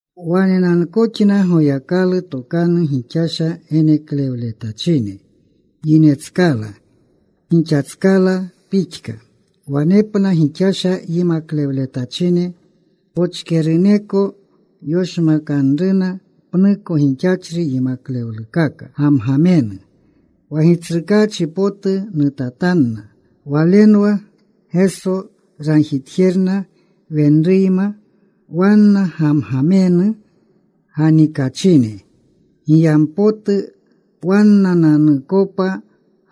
Wanenankoxna Goyakalu tokanu gixasha geneklewletachine yinetskala, gixatskala pixka wanepna gixasha yimaklewletachine. Pochkeruneko yoshmakanruna pnuko gixachri yimaklewlukaka gamgamenu. Wa Gitsrukaachi potu nutatanna. Walenwa Geso ragjitjerna wenruyma. Wanna gamgamenu ganikachine giyampotu wannananukopa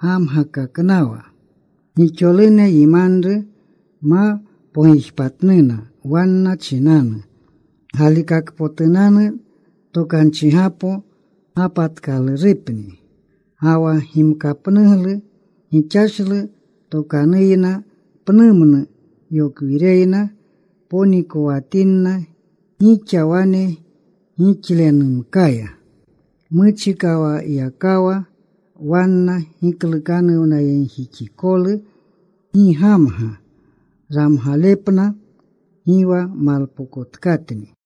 gamgakaknawa. Gixolune yimanru ma pogijpatnuna. Wanna chinanu galikakpotunanu tokanchigapo gapatkalurupni. Ga wa gimkapnugluya gixashlu tokanuyna pnumnu yokwireyna ponikowatinna gixa wane gixlenumkaya. Muchikawayakawa wanna giklukanuwnayegjixikolu gi gamga. Ramgalepna gi wa malpokotkatni.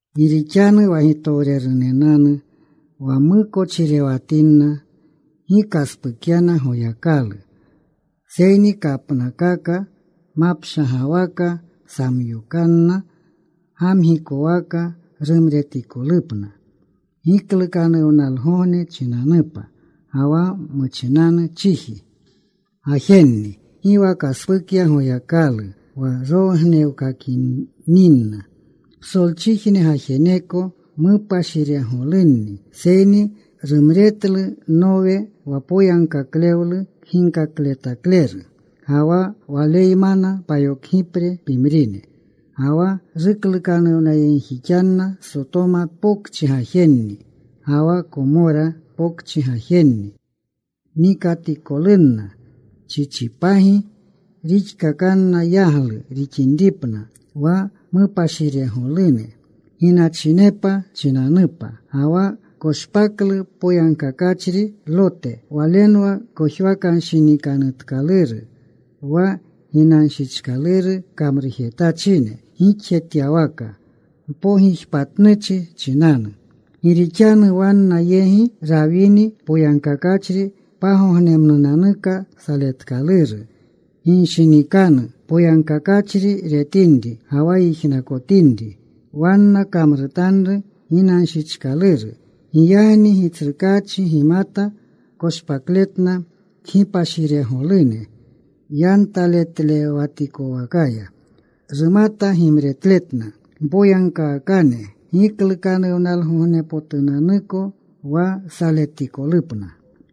Gi rixanu wa gitowrenenanu wa mukochirewatininna gi kaspukyana Goyakalu, seyni kapnakaka mapshagawaka samyokanna, gamgikowaka rumretikolupna giklukanuwnalgogne chinanupa. Ga wa muchinanu chiji gajenni gi wa kaspukya Goyakalu, wa ronnewkakininna psolchijne gajeneko mupashiregolunni. Seyni rumretlu Nowe, wa poyagkaklewlu kginkakletakleru, ga wa waleymana payokgipre pimrine. Ga wa ruklukanuwnayegjixanna Sotoma Pokchi gajenni ga wa Komora Pokchi gajenni nikatikolunna. Chichipagi rixkakanna, yaglu rixinripna wa mupashiregolune ginachinepa chinanupa. Ga wa koshpaklu poyagkakachri Lote. Walenwa kojwakanshinikanutkaluru wa ginanshichkaluru kamrujetachine gixjetyawaka mpogijpatnuchi chinanu. Gi rixanu wanna yegi rawini poyagkakachri, pagognemnunanuka saletkaluru ginshinikanu poyagkakachri retinri ga wa yijnakotinri wanna kamrutanru ginanshichkaluru. Giyagni Gitsrukaachi gimata koshpakletna kgipashiregolune yantaletlewatikowakaya. Rumata gimretletna mpoyagkaakane giklukanuwnalgognepotunanuko wa saletikolupna.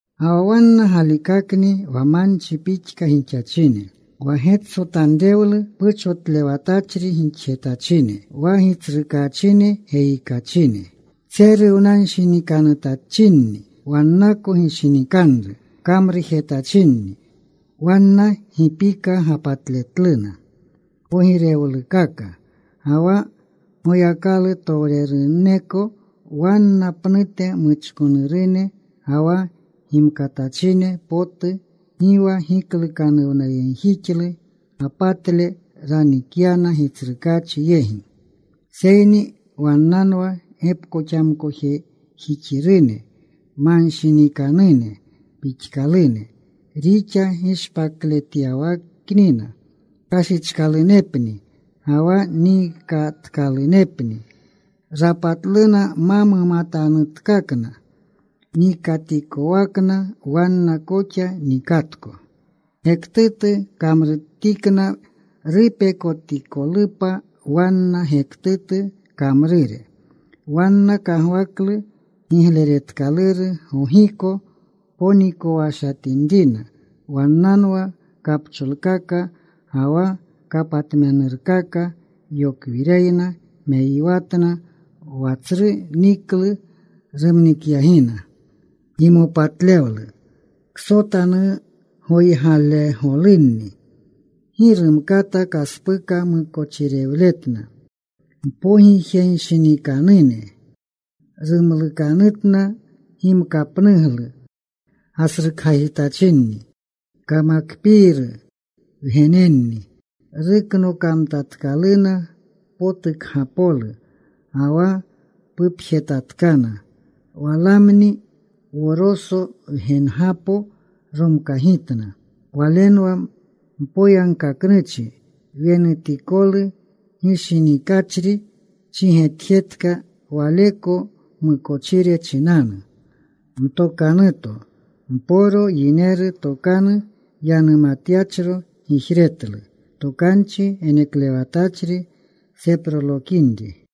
Ga wa wanna galikakni wa manchi pixka gixachine, wa getsotanrewlu puchotlewatachri gixjetachine, wa gitsrukaachine geyikachine. Tseruwanshinikanutachinni. Wannako gishinikanru kamrujetachinni. Wanna gi pika gapatletluna pogirewlukaka. Ga wa Goyakalutowreruneko wanna pnute muchkonurune ga wa gimkatachine potu gi wa giklukanuwnayegjixlu gapatle ranikyana Gitsrukaachi yegi. Seyni wannanwa gepkoxamkojejixirune manshinikanune pixkalune. Rixa gishpakletyawaknina kashichkalunepni ga wa nikatkalunepni. Rapatluna ma mumatanutkakna. Nikatikowakna wanna koxa nikatko. Gektutu kamrutikna rupekotikolupa wanna gektutu kamrure. Wanna kagwaklu gigleretkaluru gogiko ponikowashatinrina. Wannanwa kapcholkaka ga wa kapatmenurunkaka. Yokwireyna meyiwatna wa tsru niklu rumnikyagina. Gimopatlewlu ksotanugoygalegolunni. Gi rumkata kaspuka mukochirewletna. Mpoyeginshinikanune rumlukanutna. Gimkapnuglu gasrukgajitachinni. Kamakpiiru wgenenni. Ruknokamtatkaluna potukgapolu, ga wa pupjetatkana. Walaami Wosoro wgenegapo romkagitna. Walenwa mpoyagkaknuchi wenutikolu gishinikachri. Chigetjetka waleko mukochire chinanu. Mtokanuto mporo, yineru tokanu yanumatyachro, gijretlu tokanchi geneklewatachri seprolokinri.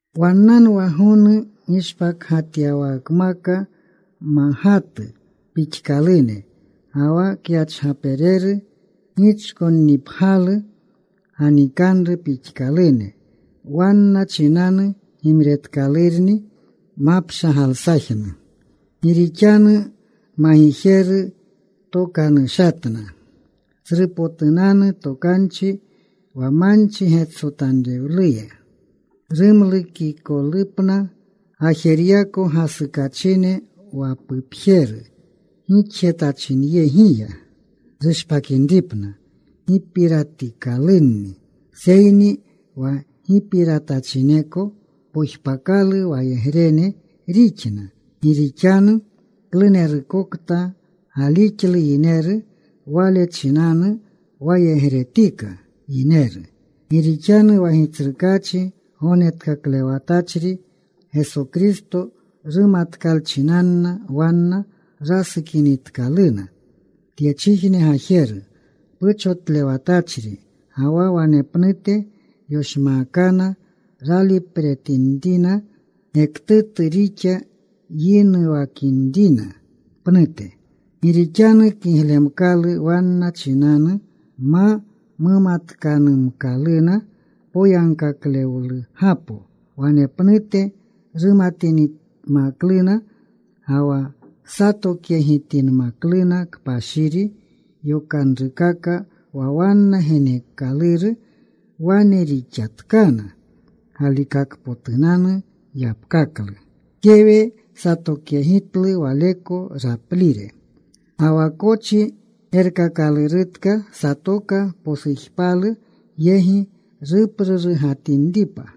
Wannanwa gonu gishpakgatyawakmaka magatu pixkalune. Ga wa kyachgapereru gichkonnipgyalu ganikanru pixkalune. Wanna chinanu gimretkalurni mapshagalsajnu. Gi rixanu magijeru tokanushatna tsrupotunanu tokanchi wa manchi getsotanrewleya rumlukikolunapna gajeryako gasukachine wa pupjeru gixjetachinyegiya. Rushpakinripna gipiratikalunni, seyni wa gipiratachineko pojpakalu wayegrene rixna. Gi rixanu klunerukokta gaalixlu yineru, wale chinanu wayegretika yineru. Gi rixanu wa Gitsrukaachi Gognetkaklewatachri Geso Kristo rumatkalchinanna wanna, rasukinitkaluna tyechijne gajeru puchotlewatachri ga wa wanepnute yoshmaakana, ralipretinrina gektutu rixa yinuwakinrina pnute. Gi rixanu kiglemkalu wanna chinanu ma mumatkanumkaluna poyagkaklewlugapo, wanepnute rumatinmakluna ga wa satokyegitinmakluna kpashiri yokanrukaka, wa wanna geneekaluru. Wane rixatkana galikakpotunanu yapkaklu: Kewe satokyegitlu waleko raplire. Ga wa kochi gerkakalurutka satoka posujpalu yegi ruprurugatinripa.